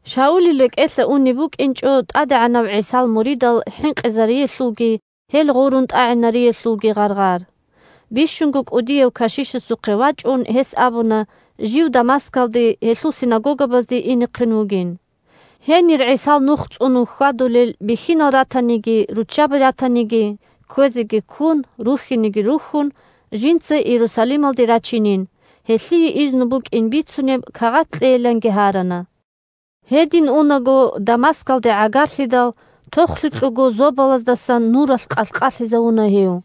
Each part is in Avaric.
Шаулил рекӀелъа унеб букӀинчӀо ТӀадегӀанав ГӀисал муридал хӀинкъизариялъулги гьел гъурун тӀагӀинариялъулги гъаргъар. Бищунго кӀудияв кашишасухъе вачӀун гьес абуна жив Дамаскалде, гьелъул синагогабазде инехъин вугин. Гьенир ГӀисал Нух цӀунун хьвадулел бихьинал ратаниги, руччаби ратаниги, кквезеги ккун, рухьинеги рухьун, жинца Иерусалималде рачинин, гьелъие изну букӀин бицунеб кагъат кьейиланги гьарана. Гьедин унаго Дамаскалде гӀагарлъидал тохлъукьего зобалаздасан нуралъ къалъ-къалъизавуна гьев.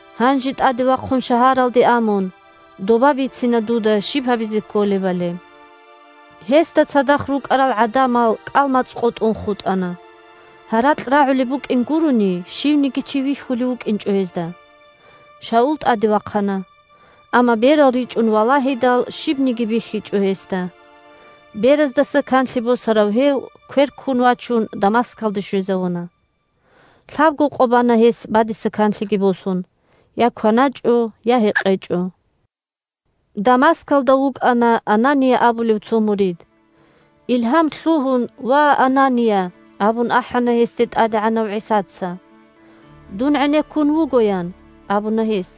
Гьанже тӀаде вахъун шагьаралде а мун, доба бицина дуда щиб гьабизе кколебали. Гьесда цадахъ рукӀарал гӀадамал кӀал-мацӀ къотӀун хутӀана. Гьаракь рагӀулеб букӀин гурони, щивниги чи вихьулев вукӀинчӀо гьезда. Шаул тӀаде вахъана. Амма берал ричӀун валагьидал, щибниги бихьичӀо гьесда. Бераздаса канлъи босарав гьев, квер ккун вачун, Дамаскалде щвезавуна. Лъабго къо бана гьес бадиса канлъиги босун. Я кваначӀо, я гьекъечӀо. Дамаскалда вукӀана Анания абулев цо мурид. Илгьам лъугьун: «Ва, Анания!» – абун ахӀана гьесде ТӀадегӀанав ГӀисаца. «Дун гӀенеккун вуго», – ян абуна гьес.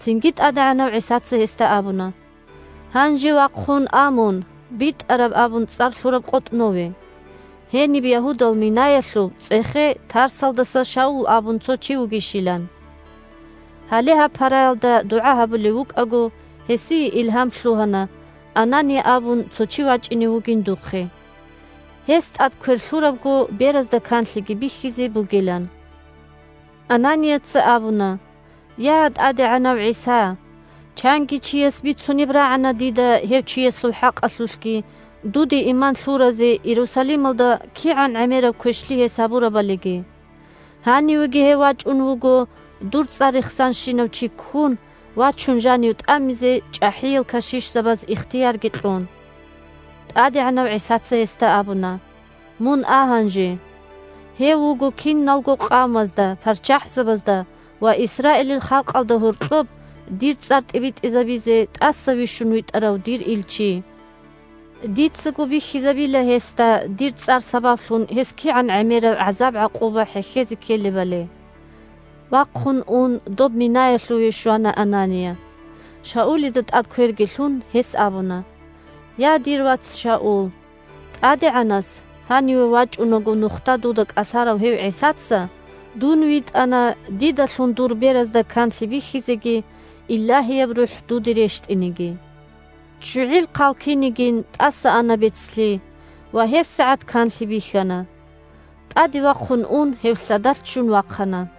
Цинги ТӀадегӀанав ГӀисаца гьесда абуна: – Гьанже вахъун а мун БитӀараб абун цӀар лъураб къотӀнове. Гьениб Ягьудал минаялъув цӀехе Тарсалдаса Шаул абун цо чи вугищилан. Гьале гьаб параялда дугӀа гьабулев вукӀаго, гьесие илгьам лъугьана Анания абун цо чи вачӀине вугин духъе, гьес тӀад квер лъурабго беразда канлъиги бихьизе бугилан. Ананияца абуна: – Я, ТӀадегӀанав ГӀиса! Чанги чияс бицунеб рагӀана дида гьев чиясул хӀакъалъулъги, дуде иман лъуразе Иерусалималда кигӀан гӀемераб квешлъи гьес гьабурабалиги. Гьанивеги гьев вачӀун вуго дур цӀар рехсанщинав чи ккун вачун жанив тӀамизе чӀахӀиял кашишзабаз ихтиярги кьун. ТӀадегӀанав ГӀисаца гьесда абуна: – Мун а гьанже. Гьев вуго киналго къавмазда, парччахӀзабазда ва Исраилил халкъалда гьоркьоб дир цӀар тӀибитӀизабизе тӀаса вищун витӀарав дир илчи. Дицаго бихьизабила гьесда дир цӀар сабаблъун гьес кигӀан гӀемераб гӀазаб-гӀакъуба хӀехьезе ккелебали. Вахъун ун доб минаялъуве щвана Анания. Шаулида тӀад кверги лъун, гьес абуна: – Я, дир вац Шаул, ТӀадегӀанас – гьаниве вачӀунаго нухда дуда кӀалъарав гьев ГӀисаца – дун витӀана дидалъун дур беразда канлъи бихьизеги Илагьияб РухӀ дуде рещтӀинеги. ЧчугӀил хъал кинигин, тӀаса ана бецлъи, ва гьебсагӀат канлъи бихьана. ТӀаде вахъун ун гьев лъадалъ ччун вахъана.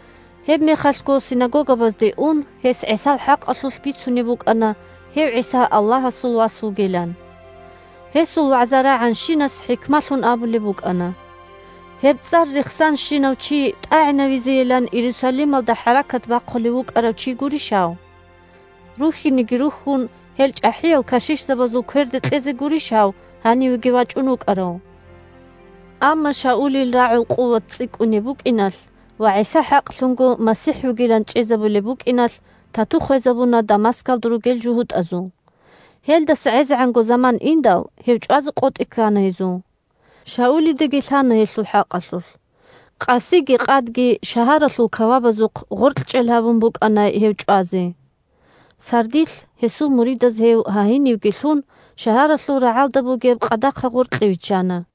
Гьебмехалъго синагогабазде ун гьес ГӀисал хӀакъалъулъ бицунеб букӀана гьев ГӀиса Аллагьасул Вас вугилан. Гьесул вагӀза рагӀанщинас хӀикмалъун абулеб букӀана: – Гьеб цӀар рехсанщинав чи тӀагӀинавизейилан Иерусалималда хӀаракат бахъулев вукӀарав чи гурищ гьав? Рухьинеги рухьун, гьел чӀахӀиял кашишзабазул кверде кьезе гурищ гьав гьанивеги вачӀун вукӀарав? Амма Шаулил рагӀул къуват цӀикӀкӀунеб букӀиналъ ва ГӀиса хӀакълъунго МасихӀ вугилан чӀезабулеб букӀиналъ тату хвезабуна Дамаскалда ругел жугьутӀазул. Гьелдаса гӀезегӀанго заман индал, гьев чӀвазе къотӀи ккана гьезул. Шаулидаги лъана гьелъул хӀакъалъулъ. Къасиги къадги шагьаралъул кавабазухъ гъоркьчӀел гьабун букӀана гьев чӀвазе. Сардилъ гьесул муридаз гьев, гьагьинивги лъун, шагьаралъул рагӀалда бугеб къадахъа гъоркье виччана.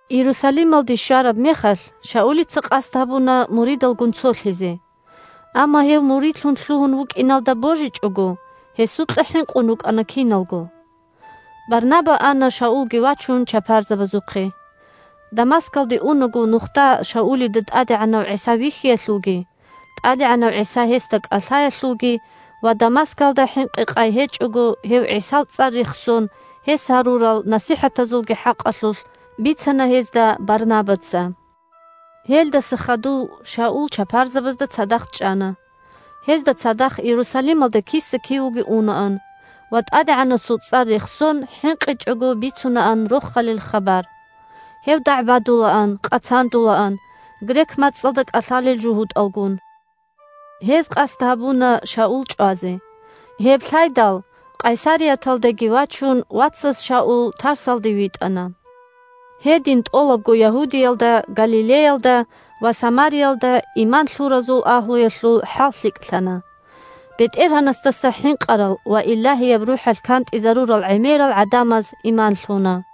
Иерусалималде щвараб мехалъ Шаулица къасд гьабуна муридалгун цолъизе. Амма гьев муридлъун лъугьун вукӀиналда божичӀого, гьесукьа хӀинкъун рукӀана киналго. Барнаба ана Шаулги вачун чапарзабазухъе. Дамаскалде унаго нухда Шаулида ТӀадегӀанав ГӀиса вихьиялъулги, ТӀадегӀанав ГӀиса гьесда кӀалъаялъулги ва Дамаскалда хӀинкъи-къай гьечӀого гьев ГӀисал цӀар рехсон гьес гьарурал насихӀатазулги хӀакъалъулъ бицана гьезда Барнабаца. Гьелдаса хадув Шаул чапарзабазда цадахъ чӀана. Гьезда цадахъ Иерусалималда киса-кивего унаан ва ТӀадегӀанасул цӀар рехсон хӀинкъичӀого бицунаан Рохалил хабар. Гьев дагӀбадулаан, къацандулаан грек мацӀалда кӀалъалел жугьутӀалгун. Гьез къасд гьабуна Шаул чӀвазе. Гьеб лъайдал, Къайсарияталдеги вачун, вацаз Шаул Тарсалде витӀана. Гьедин тӀолабго Ягьудиялда, Галилеялда ва Самариялда иман лъуразул агьлуялъул хӀал лъикӀлъана, БетӀергьанасдаса хӀинкъарал ва Илагьияб РухӀалъ кантӀизарурал гӀемерал гӀадамаз иман лъуна.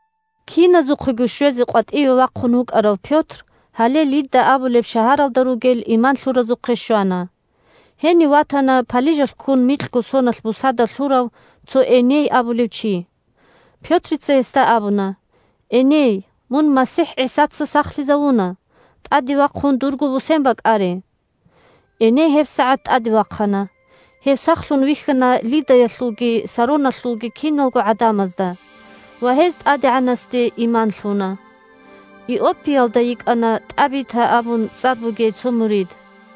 Киназухъего щвезе къватӀиве вахъун вукӀарав Пётр гьале Лидда абулеб шагьаралда ругел иман лъуразухъе щвана. Гьенив ватана палижалъ ккун микьго соналъ бусада лъурав цо Эней абулев чи. Пётрица гьесда абуна: – Эней, мун МасихӀ ГӀисаца сахлъизавуна. ТӀаде вахъун дурго бусен бакӀаре! Эней гьебсагӀат тӀаде вахъана. Гьев сахлъун вихьана Лиддаялъулги Сароналъулги киналго гӀадамазда ва гьез ТӀадегӀанасде иман лъуна. Иоппиялда йикӀана ТӀабита абун цӀар бугей цо мурид.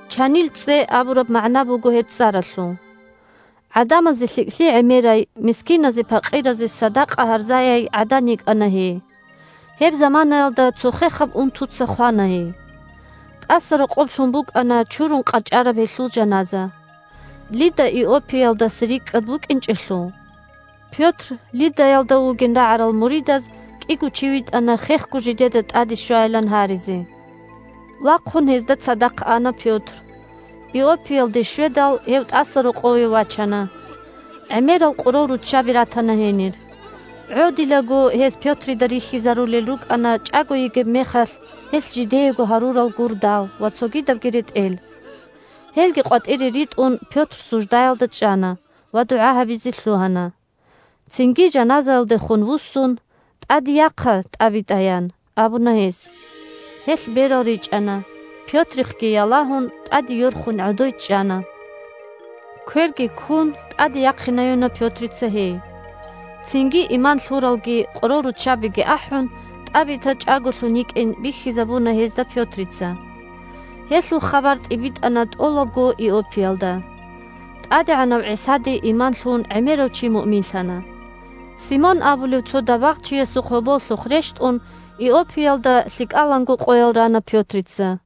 («Чанил цӀцӀе» абураб магӀна буго гьеб цӀаралъул.) ГӀадамазе лъикӀлъи гӀемерай, мискиназе-пакъиразе садакъа гьарзаяй гӀадан йикӀана гьей. Гьеб заманаялда цо хехаб унтуца хвана гьей. ТӀасарокъоб лъун букӀана чурун къачӀараб гьелъул жаназа. Лидда Иоппиялдаса рикӀкӀад букӀинчӀелъул, Пётр Лиддаялда вугин рагӀарал муридаз кӀиго чи витӀана хехго жидеда тӀаде щвайилан гьаризе. Вахъун гьезда цадахъ ана Пётр. Иоппиялде щведал, гьев тӀасарокъове вачана. ГӀемерал къоролруччаби ратана гьенир. ГӀодилаго гьез Пётрида рихьизарулел рукӀана чӀаго йигеб мехалъ гьелъ жидеего гьарурал гурдал ва цогидабги ретӀел. Гьелги къватӀире ритӀун, Пётр суждаялда чӀана ва дугӀа гьабизе лъугьана. Цинги жаназаялдехун вуссун: – ТӀаде яхъа, ТӀабита! – ян абуна гьес. Гьелъ берал ричӀана, Пётрихъги ялагьун, тӀаде йорхун гӀодой чӀана. Кверги ккун, тӀаде яхъинаюна Пётрица гьей. Цинги иман лъуралги къоролруччабиги ахӀун, ТӀабита чӀаголъун йикӀин бихьизабуна гьезда Пётрица. Гьелъул хабар тӀибитӀана тӀолабго Иоппиялда. ТӀадегӀанав ГӀисаде иман лъун гӀемерав чи муъминлъана. Симон абулев цо дабагъчиясухъ гьоболлъухъ рещтӀун Иоппиялда лъикӀаланго къоял рана Пётрица.